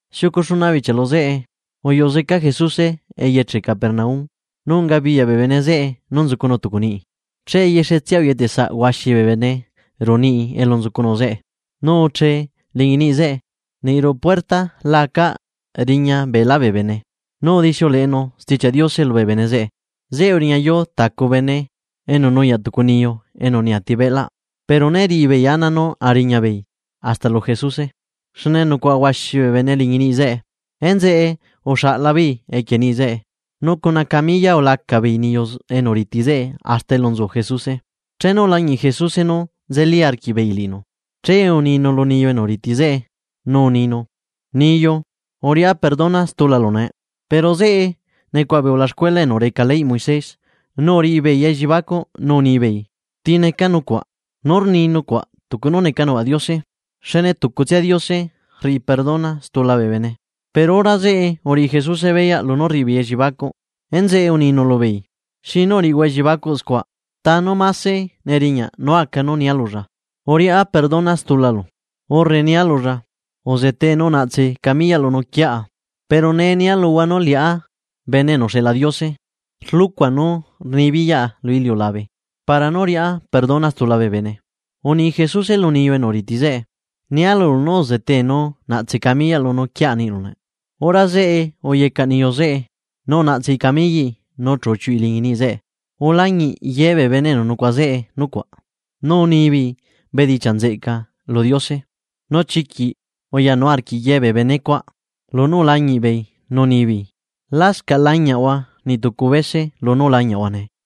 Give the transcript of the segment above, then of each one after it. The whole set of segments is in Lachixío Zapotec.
Xiucu xuna bichia lu zeꞌe, uyuꞌu zeca Jesuse eyeche Capernaum nu ungabiyaꞌ bee bene zeꞌe nú nzucunu tucu niꞌi. Che yexetsia uyetesaꞌ huaxi bee bene ruꞌu niꞌi elu nzucunu zeꞌe, nu uchee liñi niꞌi zeꞌe, niꞌ ruꞌu puerta la acaꞌ riña beelá bee bene, nu udixiuleꞌenu Stichiaꞌ Diose lubee bene zeꞌe. Zeꞌe uriñayuu tacu bene enu nuyaꞌ tucu niyu enu neati cuerpoꞌ. Pero né riꞌi beei ana nú a riña beei hasta lu Jesuse, xne nucuaꞌa huaxi bee bene liñi niꞌi zeꞌe. Enzeꞌe uxaꞌla beei equie niꞌi zeꞌe, nu cuna camilla ulaca beei niyu enu riti zeꞌe hasta elu nzu Jesuse. Chenu ulañiꞌ Jesuse nú nzeli arquiꞌbeei liꞌinu, che uninu lu niyu enu riti zeꞌe nu uninu: ―Niyu uriꞌá perdona stulalu nee. Pero zeꞌe nucuaꞌa bee ulaxcuela enu reca leyꞌ Moisés nu uriꞌi beei elliebacuꞌ nú unibeei: “¿Ti neca nucuaꞌ? Nú rni nucuaꞌ tucu nú neca nucuaꞌ Diose. Xne tucutsia Diose rriꞌi perdona xtula bee bene.” Pero hora zeꞌe uriꞌi Jesuse beyaꞌ lunú rriꞌi beei elliebacuꞌ. Enzeꞌe uninu lubeei: ―¿Xinu uriꞌihua ellibacuꞌ scua? ¿Ta nú mase neriñaꞌ nú aca nú nia lulla: “Uriꞌá perdona xtulalu”, urre nia lulla: “Uzetee, nu unaꞌtse camiyaꞌlu nu uquiaꞌa”? Pero nee lubea luhua nú liꞌá Bene enu uxeꞌla Diose rluꞌcua nú rnibiyaꞌa lu iliulabe, para nú riꞌá perdona stula bee bene. Uni Jesuse lu niyu enu riti zeꞌe: ―Nia lulu nú uzetee nu unaꞌtse camiyaꞌlu nu uquiaꞌa niꞌlu nee. Hora zeꞌe uyecaꞌ niyu zeꞌe nu unaꞌtsei camillaꞌi nu chu uchiuꞌi liñi niꞌi zeꞌe. Ulañiꞌ ye bee bene enu nucuaꞌa zeꞌe nucuaꞌ nu unibeei bedichiaꞌ nzeꞌca lu Diose. Nu chiquiꞌ uyanu arquiꞌ ye bee benecuaꞌ lunú ulañiꞌ beei nu unibeei. ―Lascaꞌ lañiaꞌhua niꞌ tucu bese lunú ulañiaꞌhua nee.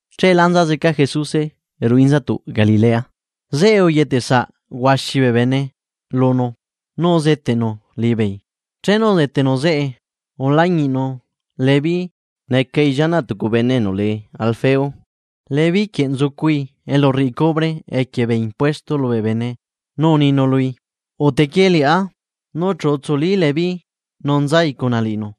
Cheelá nza zeca Jesuse ruꞌu inzatuꞌ Galilea. Zeꞌe uyetesaꞌ huaxi bee bene lunu nu uzeteꞌnu liꞌibeei. Chenu udetenu zeꞌe, ulañiꞌnu Leví necai llianaꞌ tucu bene enu lee Alfeo. Leví quieꞌ nzucui elu rriꞌi cubre equie bee impuestos lubee bene nu uninu lui: ―Ute quie liꞌá. Nu chu utsuli Leví nu nzai cuna liꞌinu.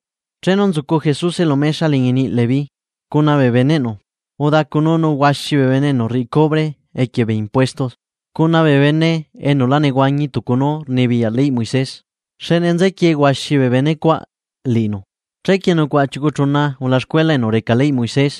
Chenu nzucu Jesuse lu mexa liñi niꞌi Leví, cuna bee beneꞌnu udacununu huaxi bee bene enu rriꞌi cubre equie bee impuestos cuna bee bene enu la nehuañi tucu nú rnibiyaꞌ leyꞌ Moisés, xne nzequie huaxi bee bene cuaꞌ liꞌinu. Chequie nucuaꞌa chiucu chuna ulaxcuela enu reca leyꞌ Moisés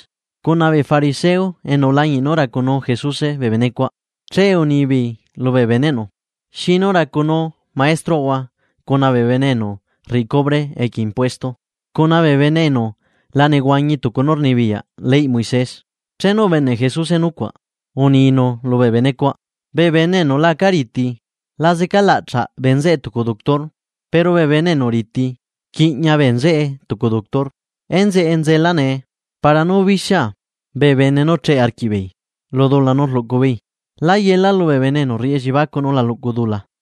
cuna bee fariseo enu ulañiꞌ nú racunuu Jesuse bee benecuaꞌ. Che unibeei lubee beneꞌnu: ―¿Xinu racunuu maestroꞌhua cuna bee bene enu rriꞌi cubre equie bee impuesto? ¿Cuna bee bene enu la nehuañi tucu nú rnibiyaꞌ leyꞌ Moisés? Chenu ubeneꞌ Jesuse nucuaꞌ, uninu lubee bene cuaꞌ: ―Bee bene enu la aca riti, la zecalaꞌchaꞌ bee nzeꞌe tucu doctor. Pero bee bene enu riti, rquiꞌña bee nzeꞌe tucu doctor. Enzeꞌe nzela nee, para nú bixia bee bene nú cheꞌe arquiꞌbeei lu dula nú rluꞌcu beei. Lá yela lubee bene enu rriꞌi elliebacuꞌ nú la luꞌcu dula.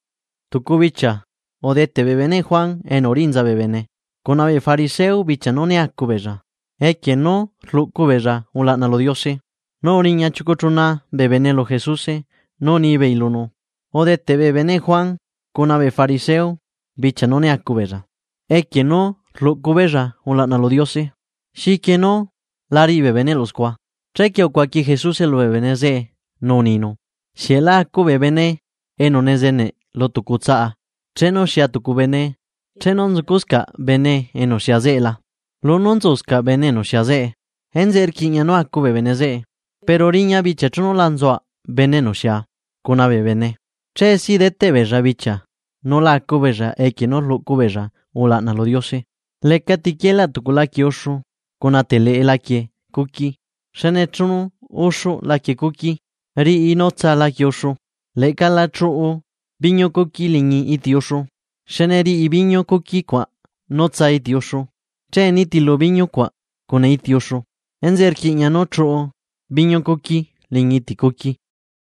Tucu bichia udeteꞌ bee beneꞌ Juan Bautista cuna bee fariseo bichia nú né acu beella equie nú rluꞌcu beella ulaꞌna lu Diose, nu uriña chiucu chuna bee bene lu Jesuse nu unibeei lunu: ―Udeteꞌ bee beneꞌ Juan cuna bee fariseo bichia nú né acu beella equie nú rluꞌcu beella ulaꞌna lu Diose. ¿Xiquie nú la riꞌi bee beneꞌlu scua? Chequie ucuaqui Jesuse lubee bene zeꞌe nú uninu: ―¿Xieꞌ la acu bee bene enu nezeneꞌ lu tucu tsaꞌa chenu xia tucu bene chenu nzucuscaꞌ bene enu xia zeꞌe la? Lunú nzuscaꞌ bene enu xia zeꞌe. Enzeꞌe rquiꞌña nú acu bee bene zeꞌe. Pero riña bichia chenu la nzuaꞌ bene enu xia cuna bee bene. Che si deteꞌ beella bichia nú la acu beella equie nú rluꞌcu beella ulaꞌna lu Diose. ’Lecati quielaꞌ tucu laquie uxu cuna teleꞌe laquie cuqui xne chenu uxuꞌ laquie cuqui riꞌi nú tsaa laquie uxu. Leꞌca la chuꞌu biñu cuqui liñi iti uxu xne riꞌi biñu cuqui cuaꞌ nú tsaa iti uxu, che nitilu biñu cuaꞌa cuna iti uxu. Enzeꞌe rquiꞌña nú chuꞌu biñu cuqui liñi iti cuqui.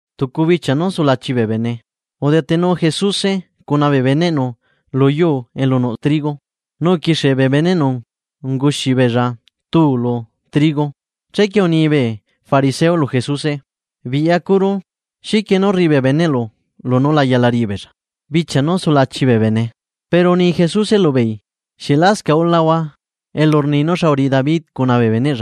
Tucu bichia nú sulachi bee bene, udetenu Jesuse bee beneꞌnu lu yuu elu nuꞌ trigo nu uquixie bee beneꞌnu unguxi beella tuu lu trigo. Chequie unibee fariseo lu Jesuse: ―Biꞌyacuru, ¿xiquie nú rriꞌi bee beneꞌlu lunú la yala riꞌi beella bichia nú sulachi bee bene? Pero uni Jesuse lubeei: ―¿Xieꞌ lascaꞌ ulahua elu rni nú xa uriꞌi David cuna bee bene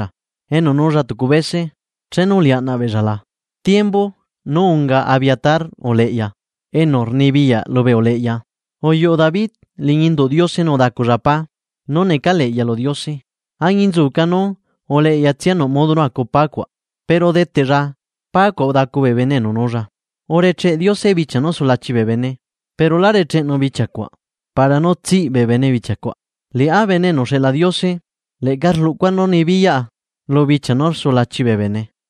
enu nuulla tucu bese chenu uliaꞌnaꞌ beella la? Tiembu nú unga Abiatar uleꞌya, enu rnibiyaꞌ lubee uleꞌya uyuꞌu David liñi induꞌ Diose nu udaculla pá nú necaleꞌya lu Diose. Añinzuca nú uleꞌyatsia nuꞌ modo nú acu pá cuaꞌ. Pero udeteꞌlla pácuaꞌ udacu bee bene enu nuulla. ’Urecheꞌ Diose bichia nú sulachi bee bene, pero lá recheꞌenu bichia cuaꞌ para nú nehuana zeca bee bene bichia cuaꞌ. ’Liꞌá Bene enu uxeꞌla Diose leꞌca rluꞌcua nú rnibiyaꞌa lu bichia nú sulachi bee bene.